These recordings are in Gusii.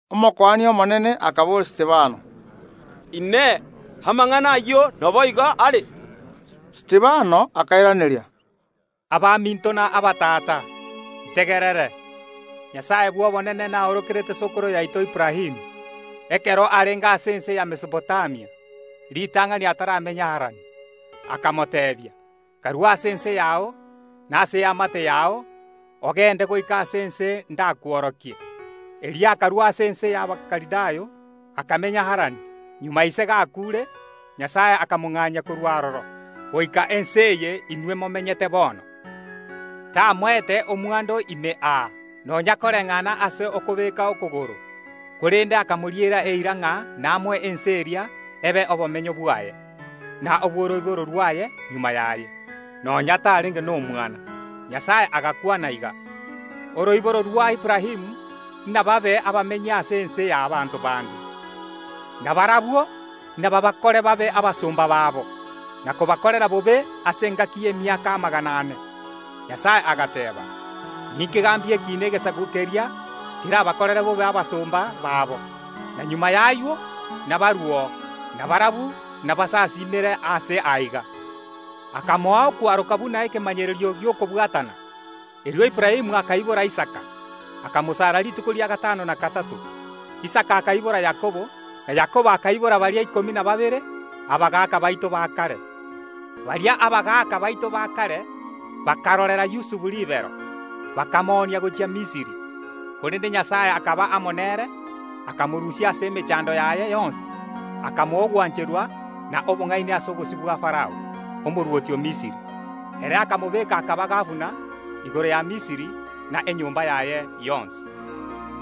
Omokuani omonene akaboria Stefano: “Inee! Amang’ana ayio naboigo are?” Stefano akairaneria. Abaminto na abatata, ntegerere. Nyasae bw’obonene naorokerete sokoro yaito Aburaamu, ekero arenge ase Mesopotamia, ritang’ani ataramenya Harani, akamoteebia: Karue ase ense yao, na ase eamate yao, ogende goika ase ense ndakworokie. Erio akarua ase ense y’Abakalidayo, akamenya Harani. Magega ise gakuure, Nyasae akamong’anyia korwa aroro goika ense eye inwe momenyete bono. Tamoete omwando ime aa, nonya koreng’ana ase akobeeka okogoro, korende akamoriera eira ng’a namoe ense eria ebe obomenyo bwaye, na obw’oroiboro rwaye magega yaye, nonya tarenge nomwana. Nyasae agakwana iga: Oroiboro rwa Aburaamu inababe abamenyi ase ense y’abanto bande, na barabwo inababakore babe abasomba babo, na kobakorera bobe, ase engaki y’emiaka amagana ane. Nyasae agateeba: Ninkegambie ekiina egesaku keria kerabakore babe abasomba babo, na magega y’ayio nabaruo, na barabwo nabansasiimere aase aiga. Akamoa okwaroka buna ekemanyererio gi’okobwatana. Erio Aburaamu akaibora Isaka, akamosara rituko ria gatano na gatato. Isaka akaibora Yakobo, na Yakobo akaibora baria ikomi na babere, abagaaka baito ba kare. Baria abagaaka baito ba kare bakarorera Yusufu ribero, bakamoonia gochia Misiri. Korende Nyasae akaba amo nere, akamorusia ase emechando yaye yonsi, akamoa ogwancherwa na obong’aini ase obosio bwa Farao, omorwoti o Misiri; ere akamobeka akaba gabana igoro ya Misiri na enyomba yaye yonsi.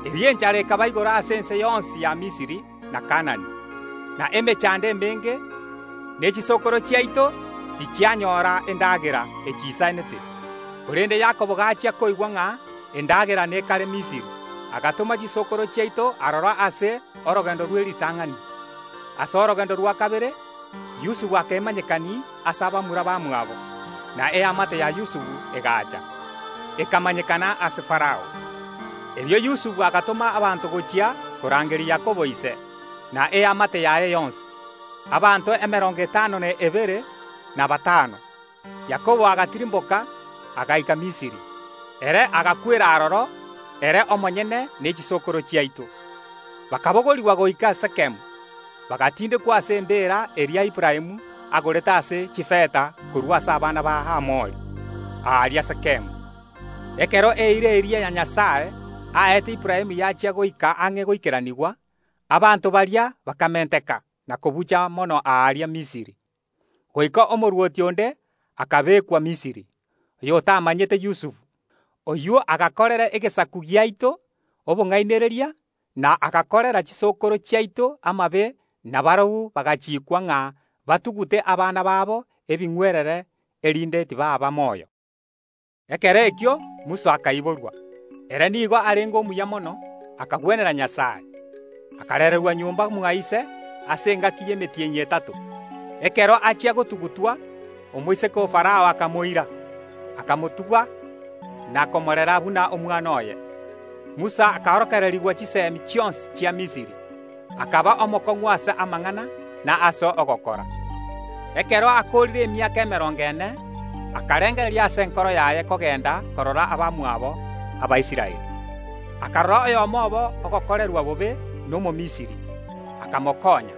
Erio enchara ekaba igoro ase ense yonsi ya Misiri na Kaanani, na emechando emenge, ne chisokoro chiaito tichianyora endagera echiisanete. Korende Yakobo gachia koigwa ng’a endagera nekare Misiri, agatoma chisokoro chiaito aroro ase orogendo rwe ritang’ani. Ase orogendo rwa kabere Yusufu akemanyekania ase bamura bamwabo, na eamate ya Yusufu egaacha, ekamanyekana ase Farao. Erio Yusufu agatoma abanto gochia korangeria Yakobo ise, na eamate yaye yonsi, abanto emerongo etano na ebere na batano. Yakobo agatirimboka, agaika Misiri; ere agakwera aroro, ere omonyene ne chisokoro chiaito. Bakabogorigwa goika Sekemu, bagatindekwa ase embeera eria Aburaamu agorete ase chifeta korwa ase abana ba Hamori, aaria Sekemu. Ekero eira eria Nyasae aete Aburaamu yachia goika ang’e goikeranigwa, abanto baria bakamenteka na kobucha mono aaria Misiri, goika omorwoti onde akabeekwa Misiri, oyotamomanyete Yusufu. Oyio agakorera egesaku giaito obong’ainereria, na agakorera chisokoro chiaito amabe, na barabwo bagachiikwa ng’a batugute abana babo ebing’werere, erinde tibaaba moyo. Ekero ekio Musa akaiborwa, ere nigo arenge omuya mono, akagwenera Nyasae. Akarererwa nyomba mwa ise ase engaki y’emetienyi etato. Ekero achia gotugutwa, omoiseke o Farao akamoira, ’akamotuga na komorera buna omwana oye. Musa akaorokererigwa chiseemi chionsi chia Misiri, akaba omokong’u ase amang’ana na ase ogokora. Ekero akoorire emiaka emerongo ene, akarengereria ase enkoro yaye kogenda korora abamwabo, Abaisraeli. Akarora oyomo obo ogokorerwa bobe n’Omomisiri, akamokonya;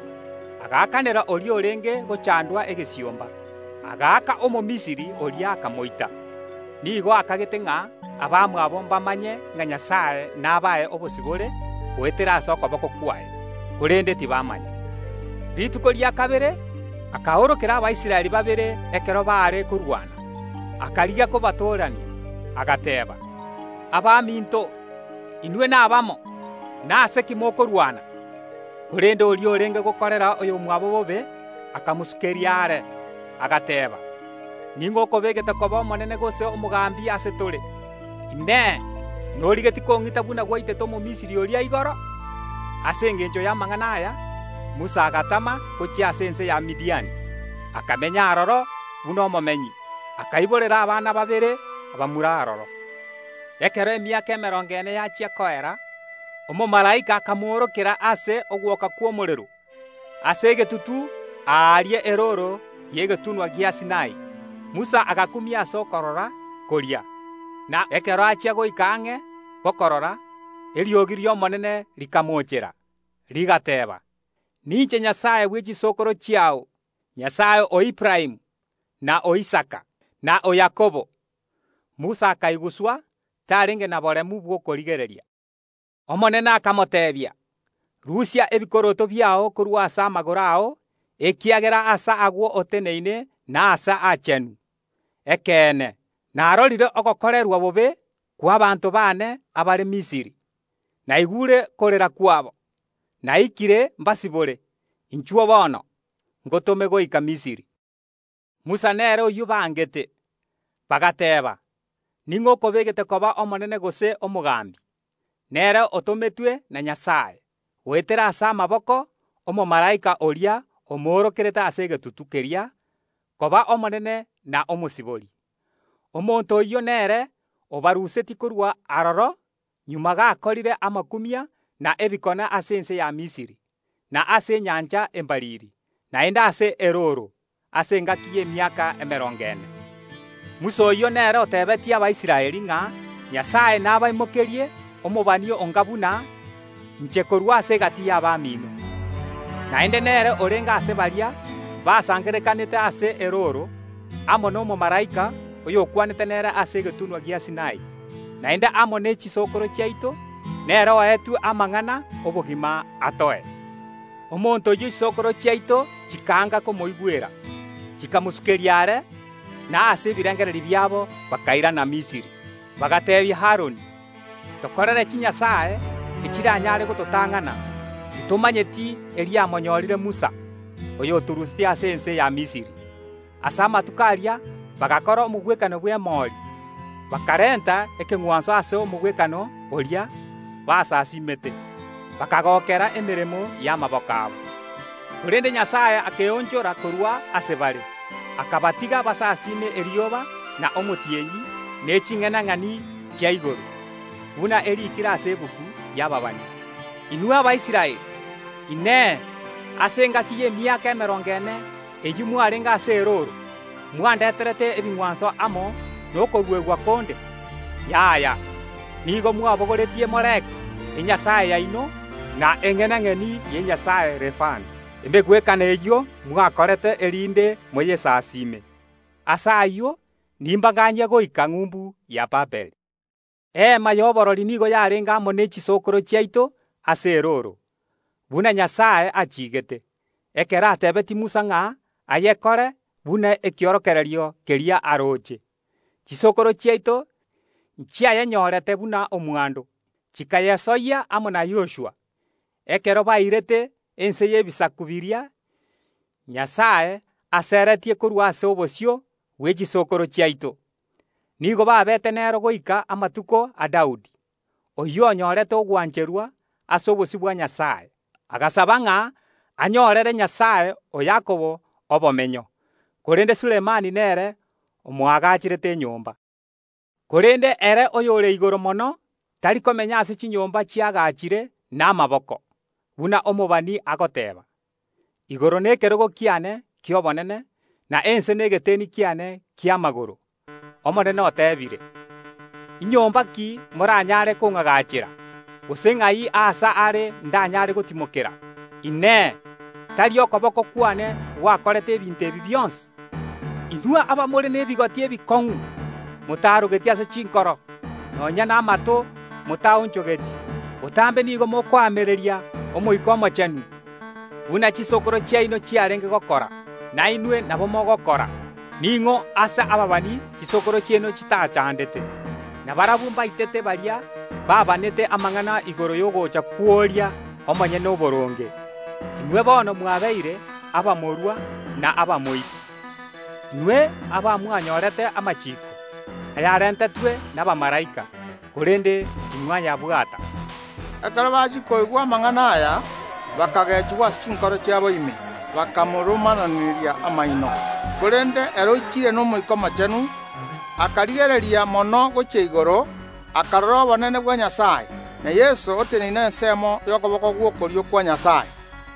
agaakanera oria orenge gochandwa egesiomba, agaaka Omomisiri oria akamoita. Nigo akagete ng’a abamwabo mbamanye ng’a Nyasae nabae obosibore goetera ase okoboko kwaye, korende tibamanya. Rituko rikobwatia akaorokera Abaisraeli babere ekero baare korwana, akarigia kobatorania agateeba: Abaminto, inwe nabamo, nase ki mokorwana? Korende oria orenge gokorera oyomwabo bobe, akamosukeria are, agateeba: Ning’o okobegete koba omonene gose omogambi ase tore? Inee! Norigetie kong’ita buna gwaita Omomisiri oria igoro? Ase engencho y’amang’ana aya Musa agatama gochia ase ense ya Midiani, akamenya aroro buna omomenyi. Akaiborera abana babere abamura aroro. Ekero emiaka emerongo ene yachia koera, omomalaika akamoorokera ase ogwoka kw’omorero ase egetutu aaria erooro y’egetunwa gia Sinai. Musa agakumia ase okorora koria, na ekero achia goika ang’e gokorora, eriogi ri’Omonene rikamocheera, rigateeba: Ninche Nyasae bwe chisokoro chiao, Nyasae o Aburaamu, na o Isaka, na o Yakobo. Musa akaiguswa, tarenge na boremu bw’okorigereria. Omonene akamoteebia: Rusia ebikoroto biao korwa ase amagoro ao, ekiagera aase agwo oteneine nase aachenu. Ekeene, narorire ogokorerwa bobe kw’abaanto baane abare Misiri, naigure okorera kwabo, naikire mbasibore. Inchuo bono, ngotome goika Misiri. Musa nere oyio bangete, bagateeba: Ning’o okobegete koba omonene gose omogambi? Nere otometwe na Nyasae, goetera ase amaboko ’omomalaika oria omoorokerete ase egetutu keria, koba omonene na omosibori. Omonto oyio nere obarusetie korwa aroro magega gakorire amakumia na ebikone ase ense ya Misiri, na ase Enyancha Embariri, naende ase erooro ase engaki y’emiaka emerongo ene. Musa oyio nere oteebetie Abaisraeli ng’a: Nyasae nabaimokerie omobani onga buna inche korwa ase egati y’abamino. Naende nere orenge ase baria basangererekanete ase erooro amo nomomalaika oyokwanete nere ase egetunwa gia Sinai, naende amo ne chisokoro chiaito; nere oetwe amang’ana ’obogima atoe. Omonto oyio chisokoro chiaito chikaanga koimoigwera, chikamosukeria are. Na ase ebirengererio biabo bakairana Misiri, bagateebia Aroni: Tokorere chinyasae echiranyare gototang’ana. Titomanyeti eriamonyorire Musa, oyotorusetie ase ense ya Misiri. Ase amatuko aria bagakora omogwekano bw’emori, bakarenta ekeng’wanso ase omogwekano oria basasiimete, bakagokera emeremo y’amaboko abo. Korende Nyasae akeonchora korwa ase bare, akabatiga basasiime erioba na omotienyi ne ching’enang’eni chia igoro, buna ariikire ase egetabu y’ababani: Inwe Abaisraeli, Inee, ase engaki y’emiaka emerongo ene, eyio mwarenge ase erooro, mwandeterete ebing’wanso amo nokoruegwa konde? Yaya, nigo mwabogoretie Moleki, enyasae yaino, na eng’enang’eni y’enyasae Refani, emegwekano eyio mwakorete, erinde moyesasime. Ase ayio nimbang’anyie goika ng’umbu ya Babiloni. Eema y’oborori nigo yarenge amo ne chisokoro chiaito ase erooro, buna Nyasae achigete, ekero atebeetie Musa ng’a ayekore buna ekiorokererio keria aroche. Chisokoro chiaito nchiayenyorete buna omwando, chikayesoyia amo na Yoshua, ekero bairete ense y’ebisaku biria Nyasae aseretie korwa ase obosio bwe chisokoro chiaito. Nigo babete nero goika amatuko a Daudi, oyio onyorete ogwancherwa ase obosio bwa Nyasae, agasaba ng’a anyorere Nyasae o Yakobo obomenyo. Korende Sulemani nere omoagacherete enyomba. Korende Ere Oyore Igoro Mono tari komenya ase chinyomba chiagachire namaboko, buna omobani agoteeba: Igoro nekerogo kiane ki’obonene, na ense negeteni kiane ki’amagoro. Omonene oteebire: Inyomba ki moranyaare kong’agachera? Gose ng’ai aase are ndanyaare gotimokera? Inee! Tari okoboko kwane gwakorete ebinto ebi bionsi? “Inwe abamore nebigoti ebikong’u, motarogeti ase chinkoro, nonya namato, motaonchogeti; botambe nigo mokoamereria Omoika Omochenu. Buna chisokoro chiaino chiarenge gokora, nainwe nabo mogokora. Ning’o ase ababani chisokoro chiaino chitachandete? Na barabwo mbaitete baria babanete amang’ana igoro y’ogocha kw’oria Omonyene Oboronge. Inwe bono mwabeire abamorua na abamoiti. Inwe abamwanyorete amachiiko ayarentetwe nabamalaika, korende timwayabwata.” Ekero bachia koigwa amang’ana aya, bakagechigwa ase chinkoro chiabo ime, bakamoromananeria amaino. Korende ere oichire n’Omoika Omochenu, akarigereria mono gochia igoro, akarora obonene bwa Nyasae, na Yeso oteneine ensemo y’okoboko gw’okorio kwa Nyasae.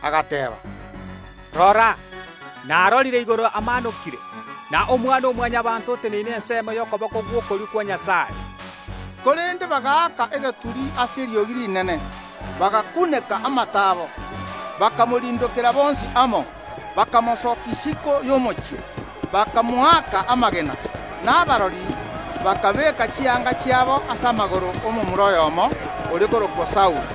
Agateeba: “Rora, narorire igoro amaanokire, na Omwana‐o‐Mwanyabaanto oteneine ensemo y’okoboko gw’okorio kwa Nyasae.” Korende bagaaka egeturi ase eriogi rinene, bagakuneka amato abo, bakamorindokera bonsi amo, bakamosokia isiko y’omochie, bakamoaka amagena. Na kirori bakabeeka chianga chiabo ase amagoro ’omomura oyomo, ore korokwa Saulo.